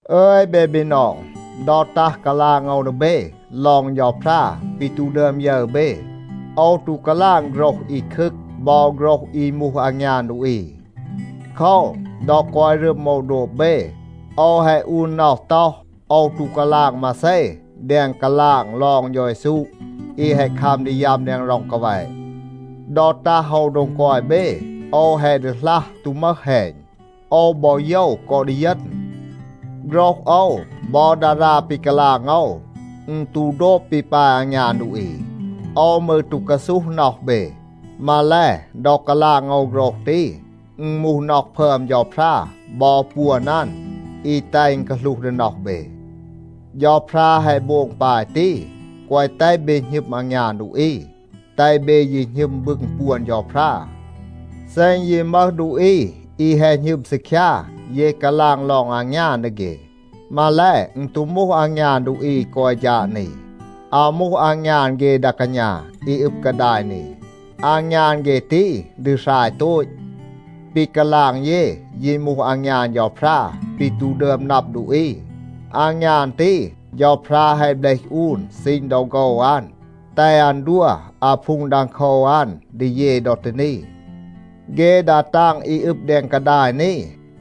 อึย เบ บีนอง, ดอ ตัห กาลาง โอว ดี เบ ลอง เฌาพรา ปี ตู ดึอม ยึร เบ, โอว ตู กาลาง โฆรห อี คึกคัม บอ โฆรห อี มูห อางยาน ดูอี. โคว, ดอ กอย รึม โอว โดบ เบ, โอว แฮะ อูน น็อห ต็อห, โอว ตู กาลาง มาเซ แดง กาลาง ลอง เฌา เยซู อี แฮะ คัม ดี ยัม แดง ร็อง กาแวะ. ดอ ตัห โอว โดง กอย เบ, โอว แฮะ ดีหลัห, ตู มึห แฮณ. โอว บอ โยว กอ ดีเยณ. โฆรห โอว บอ ดารา ปี กาลาง โอว, อึณ ตู โดบ ปี ปาย อางยาน ดูอี. โอว มืร ตู กาซูห น็อห เบ. มาแล, ดอ กาลาง โอว โฆรห ตี, อึณ มูห น็อห พึอม เฌาพรา บอ ปวน อัน อี แตห อึณ กาหลูห ดี น็อห เบ. เฌาพรา แฮะ โบง ปาย ตี, แกวะ แตห เบ หณึม อางยาน ดูอี, แตห เบ ยี หณึม บึง ปวน เฌาพรา. เซ อึณ ยี มึห ดูอี อี แฮะ หณึม ซีคยา, เย กาลาง ลอง อางยาน ดี เฆ. มาแล, อึณ ตู มูห อางยาน ดูอี อี กอย ฌาด นี. อาว มูห อางยาน เฆ ดา กาณา อี อึบ กาดาย นี. อางยาน เฆ ตี ดี หราย โตต. ปี กาลาง เย ยี มูห อางยาน เฌาพรา ปี ตู ดึอม นับ ดูอี. อางยาน ตี เฌาพรา แฮะ เบลห อูน ซีณ ดอ โฆว อัน, แตห อัน ดัว อาพูง ดังโคว อัน ดี เย ดอ ตี นี. เฆ ดา ตาง อี อึบ แดง กาดาย นี,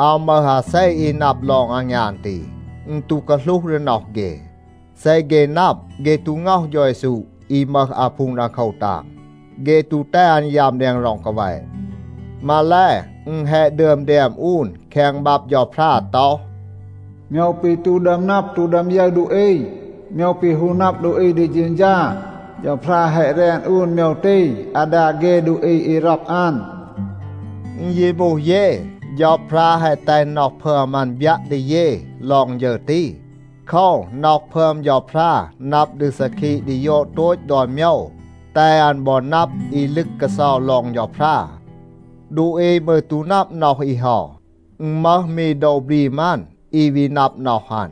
อาว มึห อาเซ อี นับ ลอง อางยาน ตี, อึณ ตู กาหลูห ดี น็อห เฆ. เซ เฆ นับ, เฆ ตู ง็อห เฌา เยซู อี มึห อาพูง ดังโคว ตาง. เฆ ตู แตห อัน ยัม แดง ร็อง กาแวะ. มาแล, อึณ แฮะ ดึอม แดม อูน แคง บับ เฌาพรา ต็อห, “โมยว ปี ตู ดึอม นับ, ตู ดึอม ยึร ดูอี, โมยว ปี ฮู นับ ดูอี ดี เฌณฌา, เฌาพรา แฮะ แรน อูน โมยว ตี อาดา เฆ ดูอี อี ร็อก อัน.” อึณ ยี มูห เย, เฌาพรา แฮะ แตห น็อห พึอม อัน บยัะ ดี เย ลอง ฌึร ตี. โคว, น็อห พึอม เฌาพรา นับ ดี ซาคีะ ดี ยอด โตต ดอน โมยว, แตห อัน บอ นับ อี ลึก กาเซา ลอง เฌาพรา. ดูอี มืร ตู นับ น็อห อี เฮา, อึณ มึห มี โดว บรีม อัน อี วี นับ น็อห อัน.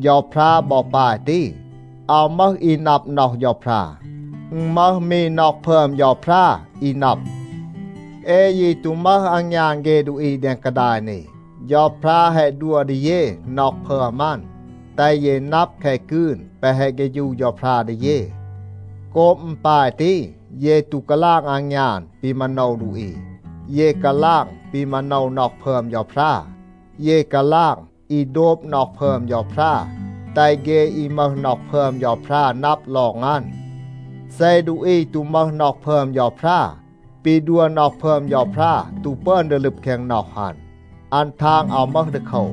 เฌาพรา บอ ปาย ตี. อาว มึห อี นับ น็อห เฌาพรา. อึณ มึห มี น็อห พึอม เฌาพรา, อี นับ. เอ ยี ตู มึห อางยาน เฆ ดูอี แดง กาดาย นี. เฌาพรา แฮะ ดัว ดี เย น็อห พึอม อัน, แตห เย นับ แคะ กืน แปะ แฮะ เฆฌู เฌาพรา ดี เย. โกบ อึณ ปาย ตี, เย ตู กาลาง อางยาน ปี มาโนว ดูอี, เย กาลาง ปี มาโนว น็อห พึอม เฌาพรา. เย กาลาง อี โดบ น็อห พึอม เฌาพรา, แตห เฆ อี มึห น็อห พึอม เฌาพรา นับ ลอง อัน. เซ ดูอี ตู มึห น็อห พึอม เฌาพรา, ปี ดัว น็อห พึอม เฌาพรา ตู ปึอน ดี ลึบ แคง น็อห อัน, อัน ทาง อาว มึห ดีโคว.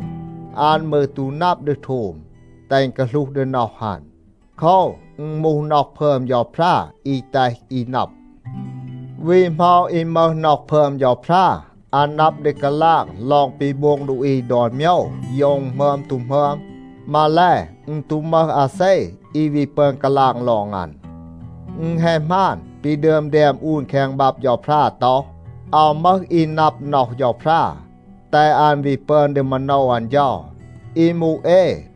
อัน มืร ตู นับ ดี โทม, แตห อึณ กาหลูห ดี น็อห อัน. โคว, อึณ มูห น็อห พึอม เฌาพรา อี แตห อี นับ. วี เหมา อี มึห น็อห พึอม เฌาพรา, อัน นับ ดี กาลาง ลอง ปี โบง ดูอี ดอน โมยว, โยว อึณ หมึอม ตู หมึอม. มาแล, อึณ ตู มึห อาเซ อี วี ปึอน กาลาง ลอง อัน. อึณ แฮะ หมาน, ปี ดึอม แดม อูน แคง บับ เฌาพรา ต็อห, “อาว มึห อี นับ น็อห เฌาพรา, แตห อัน วี ปึอน ดี มาโนว อัน เฌา.” อี มูห เอ,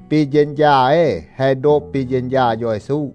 ปี เฌณฌา เอ แฮะ โดบ ปี เฌณฌา เฌา เยซู.